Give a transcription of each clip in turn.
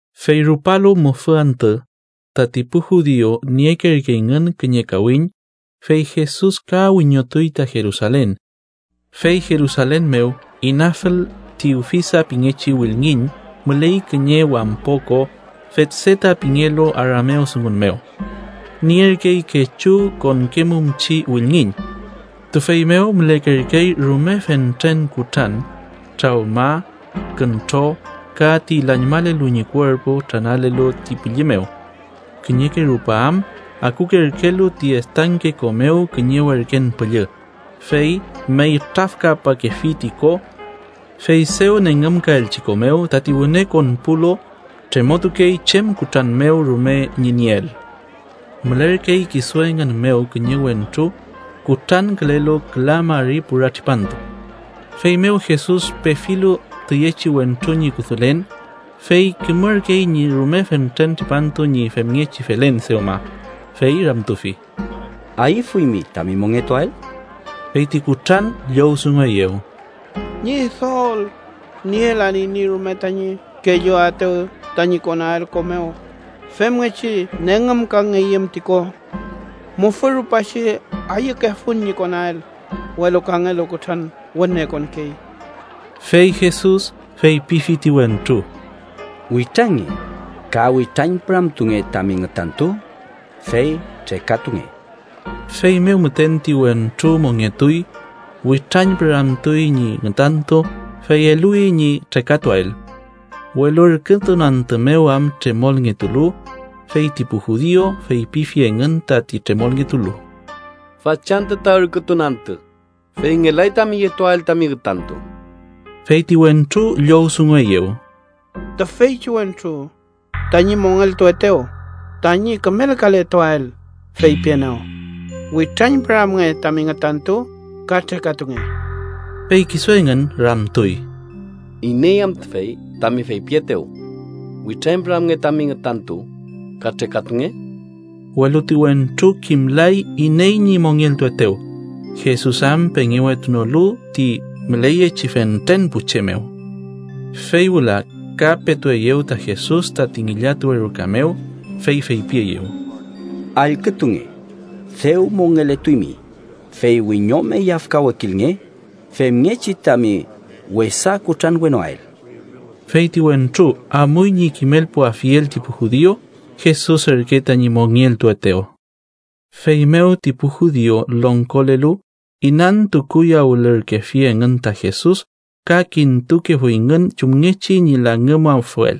Fey rupalu mufü antü, tati pu judiu niekerkeyngün kiñe kawiñ, fey Jesus ka wiñotuy ta Jerusalen. Fey Jerusalen mew inafül ti Ufisa pingechi wülngiñ, müley kiñe wampo ko Fetseta pingelu aramewdungun mew. Nierkey kechu konkemumchi wülngiñ. Tüfey mew mülekerkey rume fentren kutran, trawma, küntro ka ti lañmalelu ñi kuerpu tranalelu ti pülli mew. Kiñeke rupa am akukerkelu ti estanke ko mew kiñe werken püllü, fey meytrafkapakefi ti ko. Fey dew nengümkaelchi ko mew, tati wüne konpulu tremotukey chem kutran mew rume ñi nieel. Mülerkey kisu engün mew kiñe wentru kutrankülelu küla mari pura tripantu. Feymew Jesus pefilu tüyechi wentru ñi kudulen, fey kimürkey ñi rume fentren tripantu ñi femngechi felen dewma, fey ramtufi: —¿Ayüfuymi tami mongetuael? Fey ti kutran llowdungueyew: —Ñidol, nielan iney no rume tañi kelluaetew tañi konael ko mew femngechi nengümkangeyüm ti ko. Mufü rupachi ayükefun ñi konael, welu kangelu kutran wüne konkey. Fey Jesus feypifi ti wentru: —Witrange, ka witrañpüramtunge tami ngütantu, fey trekatunge. Feymew müten ti wentru mongetuy, witrañpüramtuy ñi ngütantu, fey eluwi ñi trekatuael. Welu ürkütun antü mew am tremolngetulu, fey ti pu judiu feypifi engün tati tremolngetulu: —Fachantü ta ürkütun antü, fey ngelay tami yetuael tami ngütantu. Fey ti wentru llowdungueyew: —Tüfeychi wentru tañi mongeltuetew tañi kümelkaletuael feypienew: ‘Witrañpüramnge tami ngütantu ka trekatunge’. Fey kisu engün ramtuy: —¿Iney am tüfey tami feypietew: ‘Witrañpüramnge tami ngütantu ka trekatunge’? Welu ti wentru kimlay iney ñi mongeltuetew, Jesus am pengewetunolu ti müleyechi fentren pu che mew. Fey wüla ka petueyew ta Jesus tati ngillatuwe ruka mew, fey feypieyew: —Allkütunge, dew mongeletuymi, fey wiñome yafkawekilnge, femngechi tami wesa kutranwenoael. Fey ti wentru amuy ñi kimelpuafiel ti pu judiu Jesus ürke tañi mongeltuetew. Feymew ti pu judiu longkolelu inantukuyawülürkefi engün ta Jesus ka kintukefuyngün chumngechi ñi langümafuel,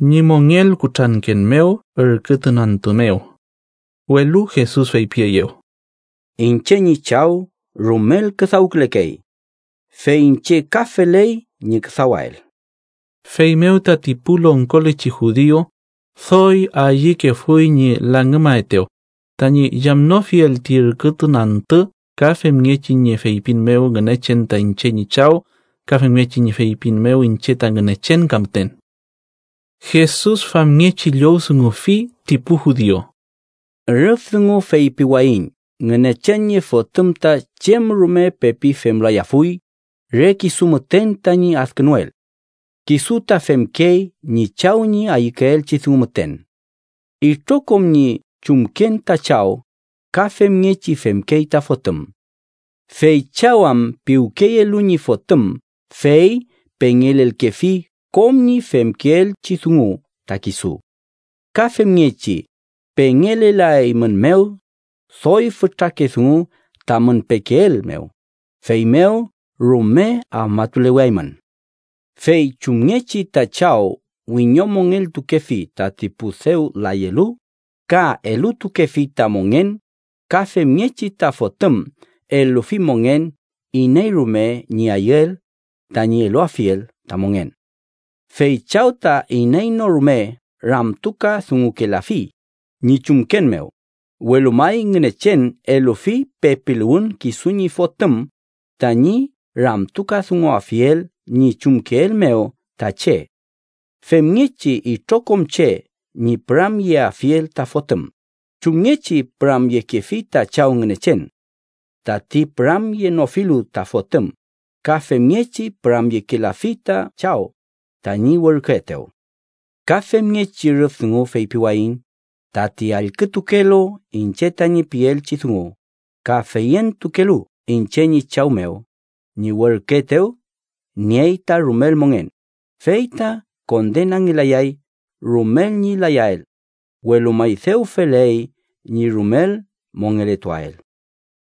ñi mongelkutranken mew ürkütun antü mew. Welu Jesus feypieyew: —Iñche ñi Chaw rumel küdawkülekey, fey iñche ka feley ñi küdawael. Feymew tati pu longkolechi judiu doy ayükefuy ñi langümaetew, tañi yamnofiel ti ürkütun antü ka femngechi ñi feypin mew Ngünechen ta iñche ñi Chaw ka femngechi ñi feypin mew iñche ta Ngünechen ka müten. Jesus famngechi llowdungufi ti pu judiu: “Rüf dungu feypiwayiñ Ngünechen ñi Fotüm ta chem rume pepi femlayafuy, re kisu müten tañi adkünuel. Kisu ta femkey ñi Chaw ñi ayükeelchi dungu müten. Itrokom ñi chumken ta Chaw, ka femngechi femkey ta Fotüm. Fey Chaw am piwkeyelu ñi Fotüm fey pengelelkefi kom ñi femkeelchi dungu ta kisu. Ka femngechi pengelelaeymünmew doy fütrake dungu, tamün pekeel mew, feymew rume afmatuleweaymün. Fey chumngechi ta Chaw wiñomongeltukefi tati pu dew layelu ka elutukefi ta mongen, ka femngechi ta Fotüm elufi mongen iney rume ñi ayüel tañi eluafiel ta mongen. Fey Chaw ta iney no rume ramtukadungukelafi ñi chumken mew, welu may Ngünechen elufi pepiluwün kisu ñi Fotüm tañi ramtukadunguafiel ñi chumkeel mew ta che femngechi itrokom che ñi püramyeafiel ta Fotüm chumngechi püramyekefi ta Chaw Ngünechen. Tati püramyenofilu ta Fotüm ka femngechi püramyekelafi ta Chaw, tañi werküetew. “Ka femngechi rüf dungu feypiwayiñ tati allkütukelu iñche tañi pielchi dungu ka feyentukelu iñche ñi Chaw mew ñi werküetew, niey ta rumel mongen, fey ta kondenangelayay rumel ñi layael, welu may dew feley ñi rumel mongeletuael.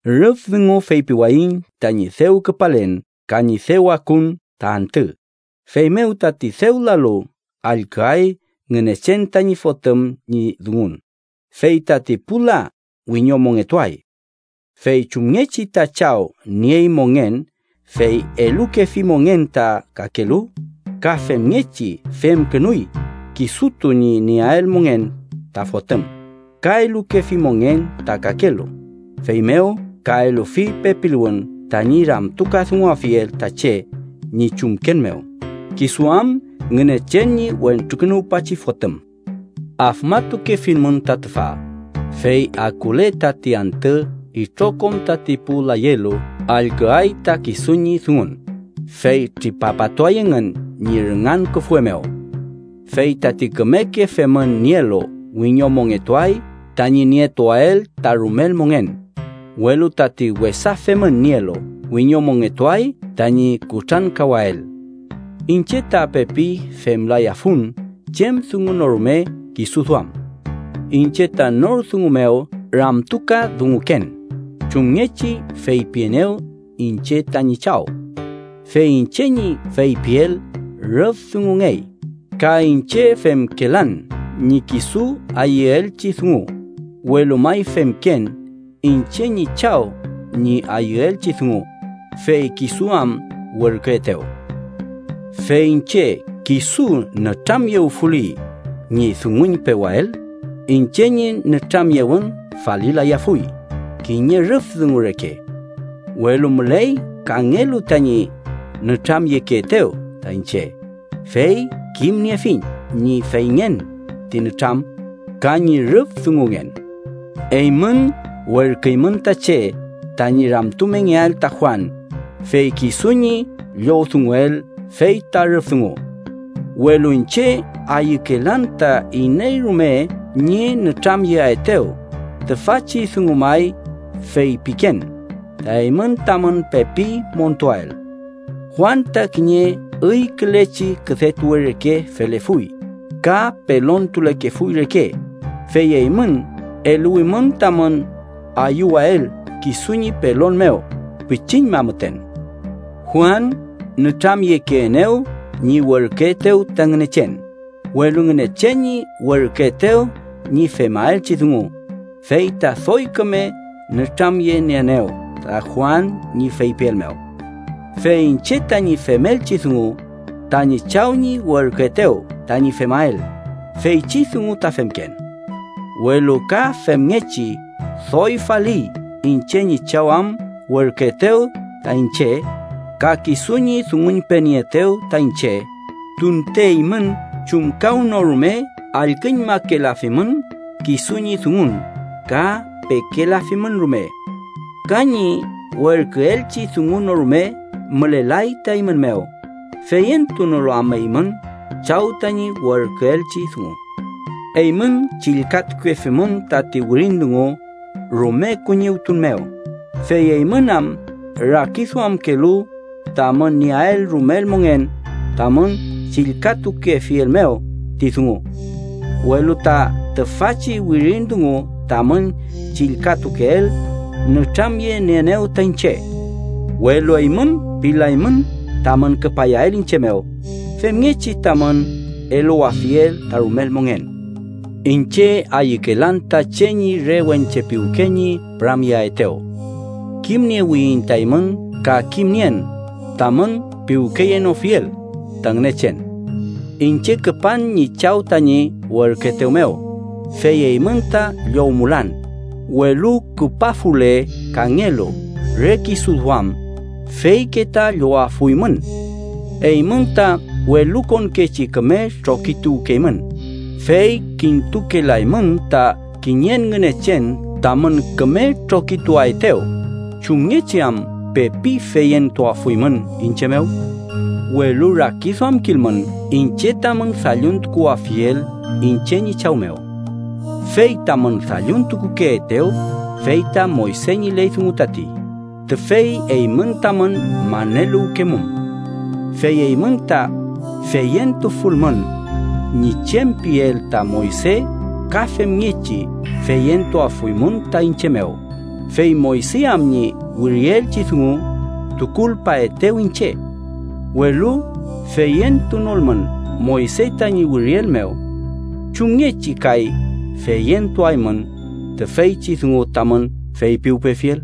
Rüf dungu feypiwayiñ tañi dew küpalen ka ñi dew akun ta antü, feymew tati dew lalu allküay Ngünechen tañi Fotüm ñi dungun, fey tati pu la wiñomongetuay. Fey chumngechi ta Chaw niey mongen fey elukefi mongen ta kakelu, ka femngechi femkünuy kisutu ñi nieael mongen ta Fotüm ka elukefi mongen ta kakelu, feymew ka elufi pepiluwün tañi ramtukadunguafiel ta che ñi chumken mew, kisu am Ngünechen ñi Wentrukünuwpachi Fotüm. “Afmatukefilmün ta tüfa, fey akule tati antü itrokom tati pu layelu allküay ta kisu ñi dungun, fey tripapatuay engün ñi rüngan küfwe mew. Fey tati kümeke femün nielu wiñomongetuay tañi nietuael ta rumel mongen, welu tati wesa femün nielu, wiñomongetuay tañi kutrankawael. Iñche ta pepi femlayafun chem dungu no rume kisu duam. Iñche ta nor dungu mew ramtukadunguken chumngechi feypienew iñche tañi Chaw. Fey iñche ñi feypiel rüf dungungey, ka iñche femkelan ñi kisu ayüelchi dungu, welu may femken iñche ñi Chaw ñi ayüelchi dungu, fey kisu am werküetew. “Fey iñche kisu nütramyewfuli ñi dunguñpewael, iñche ñi nütramyewün falilayafuy kiñe rüf dungu reke. Welu müley kangelu tañi nütramyekeetew ta iñche, fey kimniefiñ ñi feyngen ti nütram ka ñi rüf dungungen. Eymün werküymün ta che tañi ramtumengeael ta Juan, fey kisu ñi llowdunguel fey ta rüf dungu. Welu iñche ayükelan ta iney rume ñi nütramyeaetew, tüfachi dungu may feypiken, ta eymün tamün pepi montuael. Juan ta kiñe üykülechi küdetuwe reke felefuy ka pelontulekefuy reke, fey eymün eluwimün tamün ayüwael kisu ñi pelon mew pichiñma müten. “Juan nütramyekeenew ñi werküetew ta Ngünechen, welu Ngünechen ñi werküetew ñi femaelchi dungu, fey ta doy küme nütramyenieenew ta Juan ñi feypiel mew. Fey iñche tañi femelchi dungu, tañi Chaw ñi werküetew tañi femael, feychi dungu ta femken. Welu ka femngechi doy faliy iñche ñi Chaw am werküetew ta iñche, ka kisu ñi dunguñpenieetew ta iñche, tunte eymün chumkawnorume allküñmakelafimün kisu ñi dungun ka pekelafimün rume. Ka ñi werküelchi dungu no rume mülelay ta eymün mew, feyentunolu am eymün Chaw tañi werküelchi dungu. Eymün chillkatukefimün tati wirin dungu rume kuñiwtun mew, fey eymün am rakiduamkelu tamün nieael rumel mongen tamün chillkatukefiel mew ti dungu. Welu ta tüfachi wirin dungu tamün chillkatukeel nütramyenieenew ta iñche. Welu eymün pilaymün tamün küpayael iñche mew, femngechi tamün eluwafiel ta rumel mongen. “Iñche ayükelan ta che ñi re wenche piwke ñi püramyeaetew. Kimniewiyiñ ta eymün ka kimnien tamün piwkeyenofiel ta Ngünechen. Iñche küpan ñi Chaw tañi werküetew mew, fey eymün ta llowmulan, welu küpafule kangelu re kisu duam, feyke ta llowafuymün. Eymün ta welukonkechi küme trokituwkeymün, fey kintukelaymün ta kiñen Ngünechen tamün küme trokituaetew, ¿chumngechi am pepi feyentuafuymün iñche mew? “Welu rakiduamkilmün iñche tamün dalluntukuwafiel iñche ñi Chaw mew. Fey tamün dalluntukukeetew fey ta Moyse ñi ley dungu tati, tüfey eymün tamün maneluwkemum. Fey eymün ta feyentufulmün ñi chem piel ta Moyse ka femngechi feyentuafuymün ta iñche mew, fey Moyse am ñi wirielchi dungu, tukulpaetew iñche. Welu feyentunolmün Moyse tañi wiriel mew, ¿chumngechi kay feyentuaymün tüfeychi dungu tamün feypiwpefiel?”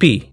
pi.